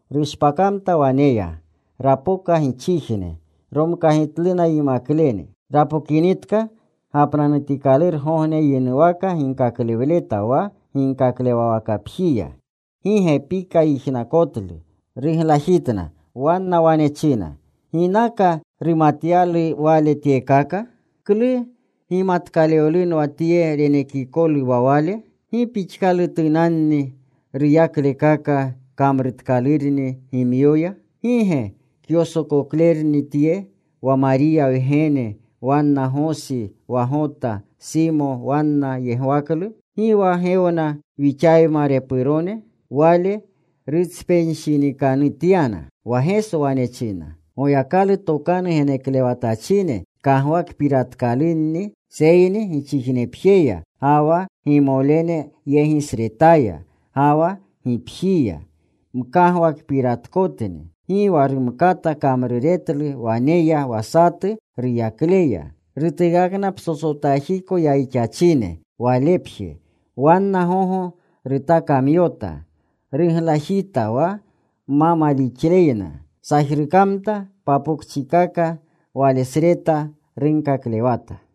Rushpakamta waneya. Rapoka gichijne. Romkagitluna yimaklene. Rapokinitka, gapnanutikalurgogne yinuwaka ginkaklewleta wa ginkaklewawakapjiya. Gi gepika yijnakotlu. Ruglajitna. Wanna wane china, “¿Ginaka rumatyalu Wale tyekaka? ¿Klu gimatkalewlunwa tye renekikolu wa Wale? ¿Gi pixkalutunanni ruyaklekaka kamrutkalurni gimyoya? ¿Gi ge kyosokoklerukni tye, wa Mariya wgene, wanna Gosi, wa Gota, Simo wanna yegwaklu? ¿Gi wa gewna wixayma repurone?” Wale rutspenshinikanutyana. Wa Geso wane china, “Goyakalu tokanu geneklewatachine kagwakpiratkalunni, seyni gichijnepjeya, ga wa gimolenyegisretaya, ga wa gipjiya mkagwakpiratkotni.” Gi wa rumkata kamruretlu waneya wa satu ruyakleya. Rutuukakna psotsotajiko yayixachine, walepje. Wanna gogo rutakamyota. Ruglajita wa ma malixleyna. Sajrukamta papokchikaka walesreta. Runkaklewata.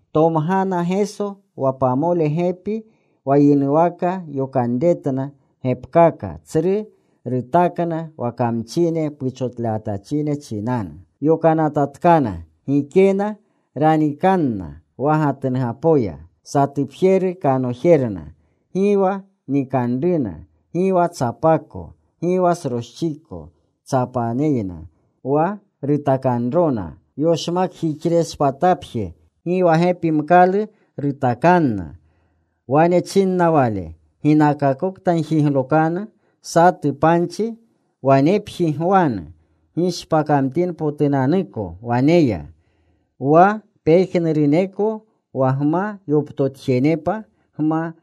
Tomgana Geso wa pamole gepi. Wa yinuwaka yokanretna gepkaka. Tsru rutakna wa kamchine puchotlewatachine chinanu. Yokanatatkana gikena ranikanna wa gatnugapoya, satupjeru kanojerna; gi wa nikanruna, gi wa tsapako, gi wa sroschiko tsapaneyna. Wa rutakanrona yoshmakjixrechishpatapje. Gi wa gepimkalu rutakanna. Wane chinna Wale, “Ginakakokta gjiglokanu satu panchi, wanepji gwanu gishpakamtinpotunanuko waneya. Wa pejnuruneko wa gma yoptotjenepa, gma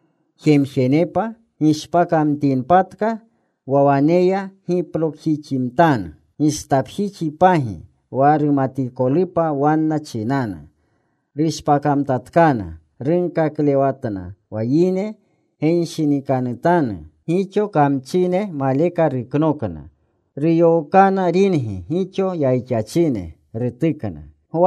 jemjenepa, gishpakamtinpatka wa waneya giplokjiximtanu gistapjixipagi wa rumatikolupa wanna chinanu.” Rushpakamtatkana. Runkaklewatna wa yine genshinikanutanu. Gixo kamchine maleka ruknokna. Ruyookana ringi gixo yayixachine. Rutukna.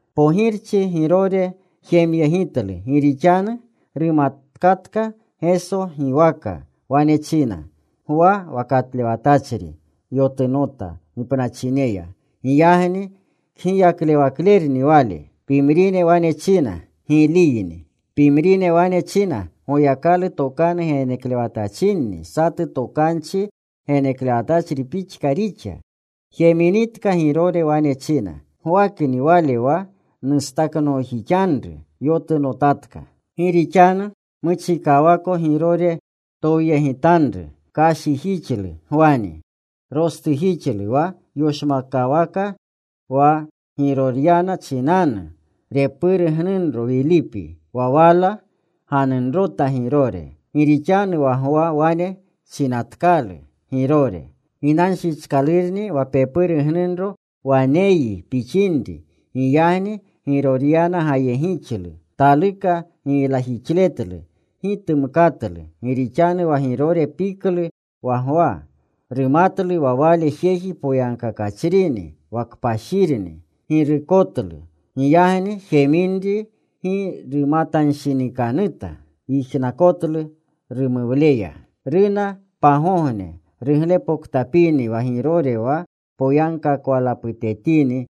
Pogirchi Girore jemyegitlu. Gi rixanu rumatkatka Geso giwaka. Wane china, “Gwa wa katlewatachri yotunota gipnachineya. Giyagni kgiyaklewaklerni Wale.” Pimrine wane china, “Giliyni.” Pimrine wane china, “Goyakalu tokanu geneklewatachrini. Satu tokanchi geneklewatachri pixka rixa.” Jeminitka Girore wane china, “Gwakni wale wa nustaknoojixanru. Yotunotatka.” Gi rixanu muchikawako Girore towyegitanru. Kashijixlu Gwani. Rostujixlu wa yoshmakwaka wa Giroryana chinanu repuru gnunro Wilipi. Wa wala ganunrota Girore. Gi rixanu wa Gwa wane chinatkalu Girore, “Ginanshichkalurni wa pepuru gnunro waneyyi pixinri.” Giyagni Giroryana gayegixlu. Taluka giylajixletlu. Gi tumkatlu. Gi rixanu wa Girore piklu wa Gwa. Rumatlu wa wale jeji poyagkakachrini wa kpashirni. Girukotlu. Giyagni jeminri gi rumatanshinikanuta. Yijnakotlu rumuwleya. Runa pagogne ruglepoktapini wa Girore wa poyagkakawalaputetini.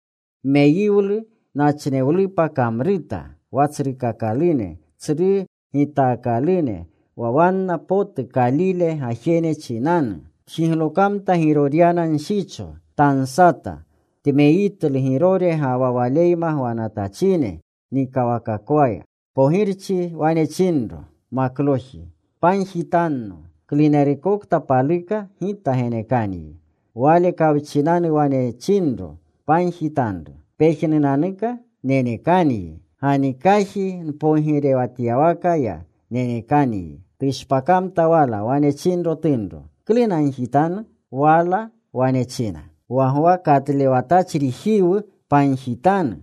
Meyiwlu nachnewlupa kamruta wa tsrukakalune, tsru gitaakalune, wa wanna potu Kalile gajene chinanu. Tjiglokamta Giroryana nshicho. Tansata. Tmeyitlu Girore ga wa waleyma gwanatachine nikawakakwa. Pogirchi wane chinro makloji, “Pagjitanno klunerukokta paluka. Gita genekanyi.” Wale kawchinau wane chinro, “Pagjitanru pejnunanuka nenekanyi. Ganikajiko npogirewatyawakaya nenekanyi.” Tushpakamta wala. Wane chinro tunro, “¿Klu nagjitanu?” Wala wane china, “Wa Gwa katlewatachrijiwu pagjitanu.”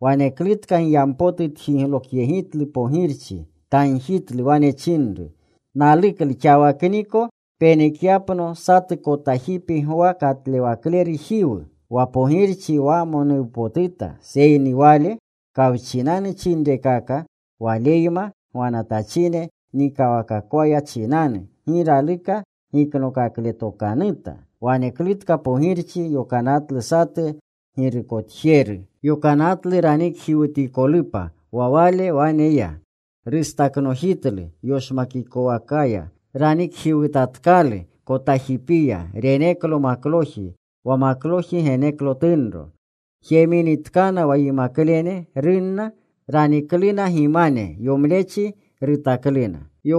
Waneklutka giyampotu tjiglokyegitlu pogirchi. Tagjitlu. Wane chinru, “Naluklu xawakniko, penekyapno satu kotajipi Gwa Katlewaklerujiwu.” Wa pogirchi wamonuwnapotuta, seyni Wale kawchinanu chinrekaka, waleyma gwanatachine nikawakakwaya chinanu, gi raluka giknokakletokanuta. Waneklutka pogirchi yokanatlu satu girukotjeru. Yokanatlu ranikjiwutikolupa. Wa wale wane ya. Rustaknojitlu yoshmakawakaya. Ranikjiwutatkalu kotajipiya. Reneklo makloji. Wa makloji geneklo tunro. Jeminitkana wa yimaklene, runna. Ranikluna gimane. Yomlechi rutakluna.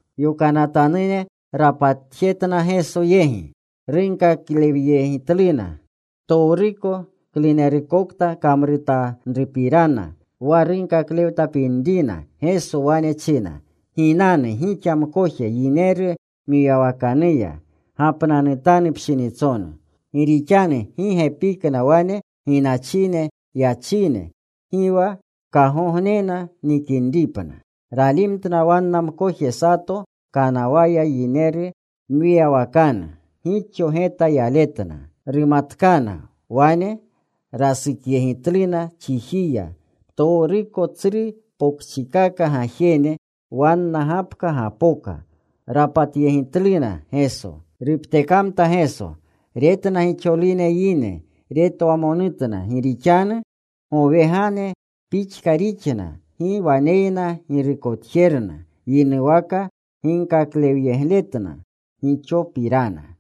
Yokanatanune rapatjetna Geso yegi. Runkaklewyegitluna ptowruko klunerukta kamrutanrunapirana, wa runkaklewtapinrina. Geso wane china, “Ginanu gixa mkoje yineru mwiyawakanuya. Gapnanutanu pshinitsonu.” Gi rixanu gi gepikna wane ginachine yachine. Gi wa kagognena nikinripna. Ralimtna wanna mkoje sato kanawaya yineru mwiyawakanu. Gixo geta yaletna. Rumatkana. Wane rasukyegitluna chijiya ptowruko tsru pokchikaka gajene. Wanna gapka gapoka. Rapatyegitluna Geso. Ruptekamta Geso. Retna gixolune yine. Retwamonutna gi rixanu gowegane pixka rixna gi waneyna girukotjerna. Yinuwaka ginkaklewyegitna gixopirana.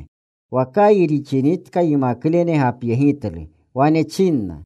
Wa kayi rixinitka yimaklene gapyegitlu. Wane chinna,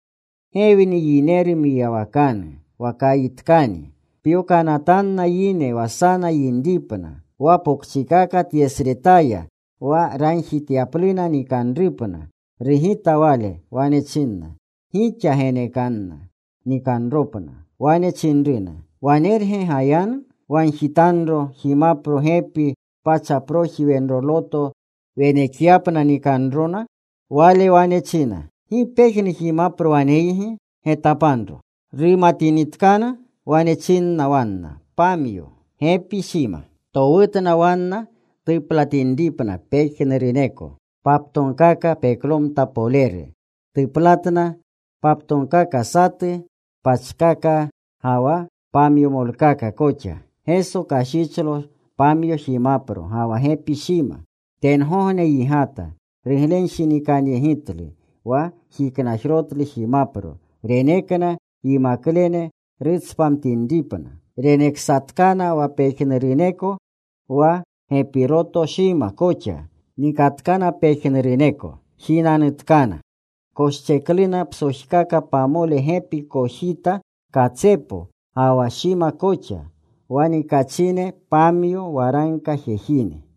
“Gewni yineru mwiyawakanu. Wa kayitkani. Pyokanatanna yine wa sana yinripna, wa pokchikaka tyesretaya wa ragjityapluna nikanrupna.” Rugita Wale. Wane china, “Gixa genekanna nikanropna.” Wane chinruna, “¿Wanerge gayanu? ¿Wagjitanro jimapro gepi pachproji wenroloto, wenekyapna nikinropna?” Wale wane china, “¿Gi pejnu jimapro waneygi? Getapanro.” Rumatinitkana. Wane chinna wanna, “Pamyo. Gepi shima.” Towutna wanna tuplatinripna pejnuruneko paptogkaka peklomta poleru. Tuplatna paptogkaka satu pachkaka ga wa pamyomolkaka koxa. Geso kashichlo pamyo jimapro ga wa gepi shima. Tengogne yigata. Ruglenshinikanyegitlu. Wa jiknajrotlu jimapro. Renekna yimaklene rutspamtinripna. Raneksatkana wa pejnuruneko wa gepiroto shima koxa. Nikatkana pejnuruneko. Jinanutkana. Koschekluna psojkaka pamole gepi kojita katsepo, ga wa shima koxa. Wa nikachine pamyo waragka jejine.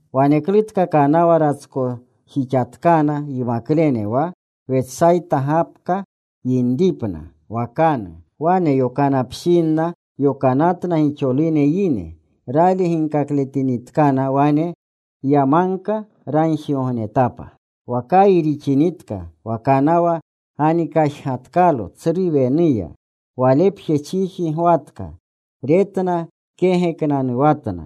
Waneklutka kanawa ratskojixatkana yimaklene wa Wetsayta gapka yinripna wakanu. Wane yakopshinna yokanatna gixolune yine. Rali gingaletinitkana wane ya magka. Ragjigognetapa. Wa kayi rixinitka wa kanawa ganikajgatkalo tsru wenuya. Walepje chiji gwatka. Retna kegeknanuwatna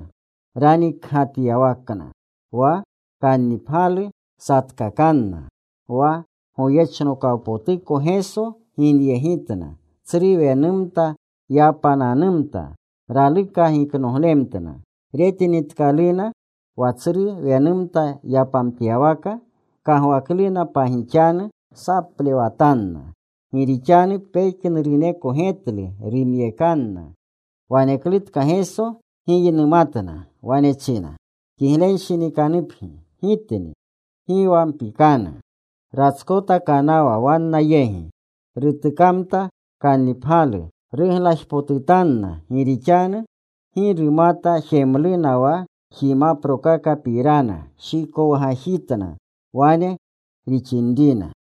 ranikgatyawakna. Wa kannipgyalu satkakanna. Wa goyechnokawpotuko Geso ginyegitna. Tsru wenumta yapananumta. Raluka giknoglemtna. Retinitkaluna wa tsru wenumta yanamtyawaka. Kagwakluna pagixanu. Saplewatanna. Gi rixanu pejnuruneko getlu. Rumyekanna. Waneklutka Geso giynumatna. Wane china, “Kiglenshinikanupgi. Gitni. Gi wa mpikanu.” Ratskota kanawa wanna yegi. Rutukamta kannipgyalu. Ruglajpotutanna. Gi rixanu gi rumata jemluna wa jimaprokakapirana. Shikowgajitna wane rixinrina.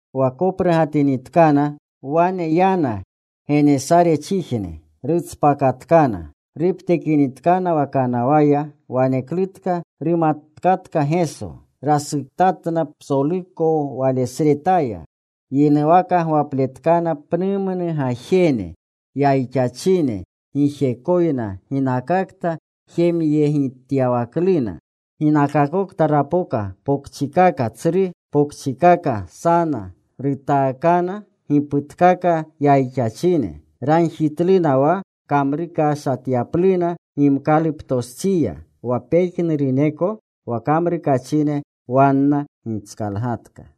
Wa koprugatinitkana, wane yana Genesarchijne. Rutspakatkana. Ruptekinitkana wa kanawaya, waneklutka rumatkatka Geso. Rasuktatna psoluko walesretaya. Yinuwaka gwapletkana pnumnu gajene yayixachine gijekoyna ginakakta jemyegityawakluna. Ginakakokta rapoka pokchikaka, tsru pokchikaka, sana, rutaakana giputkaka yayixachine. Ragjitluna wa kamrukashatyapluna gimkaluptostsiya. Wa pejnuruneko wa kamrukachine wanna gitskalgatka.